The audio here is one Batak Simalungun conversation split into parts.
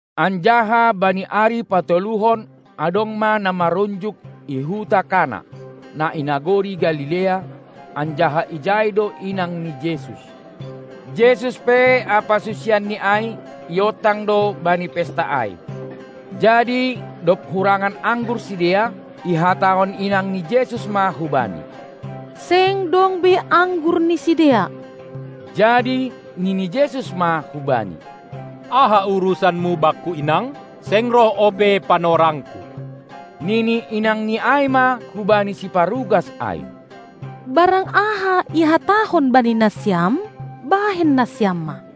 Anjaha bani ari patoluhon adong ma na marunjuk i huta Kana, na i nagori Galilea, anjaha ijai do inang ni Jesus. Jesus pe ampa susianNi ai iontang do bani pesta ai. Jadi dob hurangan anggur sidea, ihatahon inang ni Jesus ma hu Bani: Seng dong be anggur ni sidea! Jadi nini Jesus ma hubani: Aha urusanmu Bakku, inang? Seng roh ope panorangKu. Nini inangni ai ma hubani siparugas ai: Barang aha ihatahon bani nasiam, bahen nasiam ma!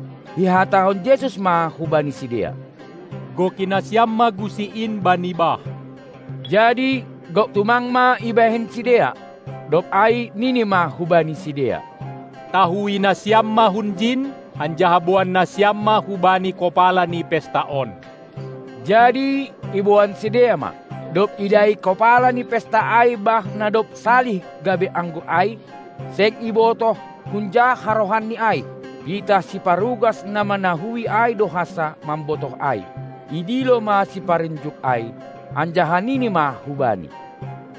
Ihatahon Jesus ma hubani sidea: Goki nasiam ma gusi in bani bah! Jadi gok tumang ma ibahen sidea. Dob ai Nini ma hubani sidea: Tahui nasiam ma hunjin, anjaha boan nasiam ma hubani kopala ni pesta on! Jadi iboan sidea ma. Dob idai kopala ni pesta ai bah na dob salih gabe anggur ai, seng ibotoh hunja harohanni ai, pitah siparugas na manahui ai do hansa mambotoh ai, idilo ma siparunjuk ai, anjaha nini ma hubani: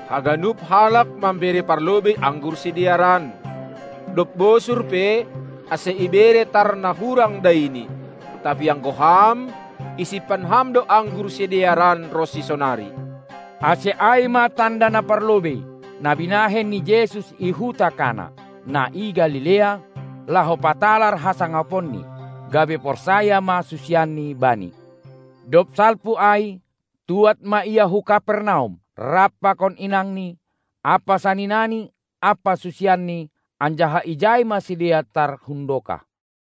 Haganup halak mambere parlobei anggur sidearan, dob bosur pe, ase ibere tar na hurang daini. Tapi anggo ham, isimpan ham do anggur sidearan ronsi sonari. Ase ai ma tanda na parlobei, na binahen ni Jesus i huta Kana, na i Galilea, laho patalar hasangaponNi, gabe porsaya ma susianni Bani. Dob salpu ai, tuad ma Ia hu Kapernaum rap pakon inangni, ampa saninaNi ampa susianNi, anjaha ijai ma sidea tar hundokah.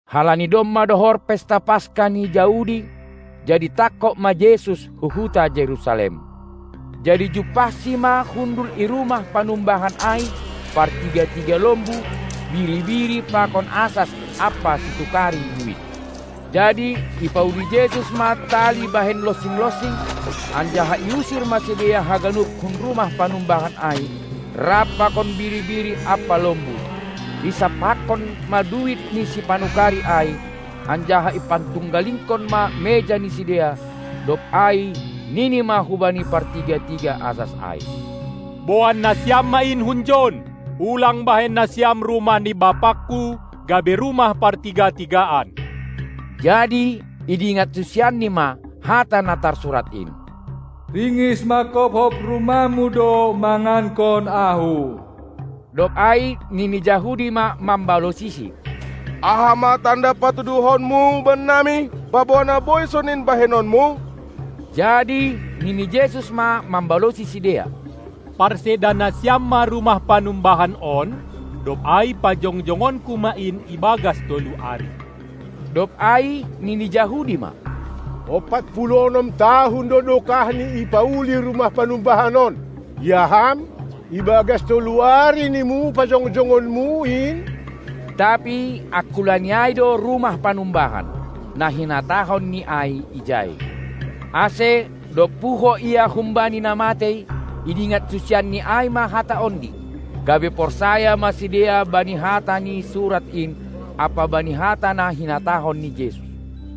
Halani domma dohor pesta Paska ni Jahudi, jadi tangkog ma Jesus hu huta Jerusalem. Jadi jumpahSi ma hundul i rumah panumbahan ai partiga-tiga lombu, biri-biri pakon asas ampa situkari duit. Jadi ipauli Jesus ma tali bahen lonsing-lonsing, anjaha iusir ma sidea haganup hun rumah panumbahan ai rap pakon biri-biri ampa lombu; isampakkon ma duit ni sipanukari ai, anjaha ipantunggalingkon ma meja ni sidea. Dob ai Nini ma hubani partiga-tiga asas ai: Boan nasiam ma in hunjon! Ulang bahen nasiam rumah ni BapaKu gabe rumah partiga-tigaan! Jadi idingat susianNi ma hata na tarsurat in: Ringis mangkopkop rumahmu do mangankon ahu. Dob ai nini Jahudi ma mambalosisi: Aha ma tanda patuduhonMu bannami, paboa na boi sonin bahenonMu? Jadi nini Jesus ma mambalosi sidea: Parseda nasiam ma rumah panumbahan on, dob ai pajongjongonku ma in ibagas tolu ari. Dob ai nini Jahudi ma: Ompat puluh onom tahun do dokahni ipauli rumah panumbahan on, ia Ham, ibagas tolu ari nimu pajongjongonMu in? Tapi angkulaNi ai do rumah panumbahan, na hinatahoNi ai ijai. Ase, dob puho Ia humbani na matei idingat susianNi ai ma hata ondi, gabe porsaya ma sidea bani hata ni surat in ampa bani hata na hinatahon ni Jesus.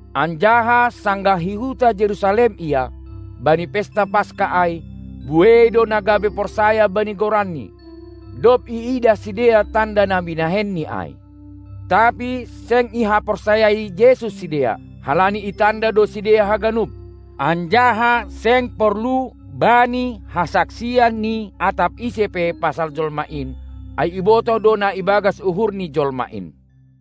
Anjaha sanggah i huta Jerusalem Ia, bani pesta Paska ai, buei do na gabe porsaya bani goranNi, dob iidah sidea tanda na binahenNi ai. Tapi seng ihaporsayai Jesus sidea, halani itanda do sidea haganup. Anjaha seng porlu Bani hasaksian ni atap ise pe pasal jolma in, ai ibotoh do na ibagas uhur ni jolma in.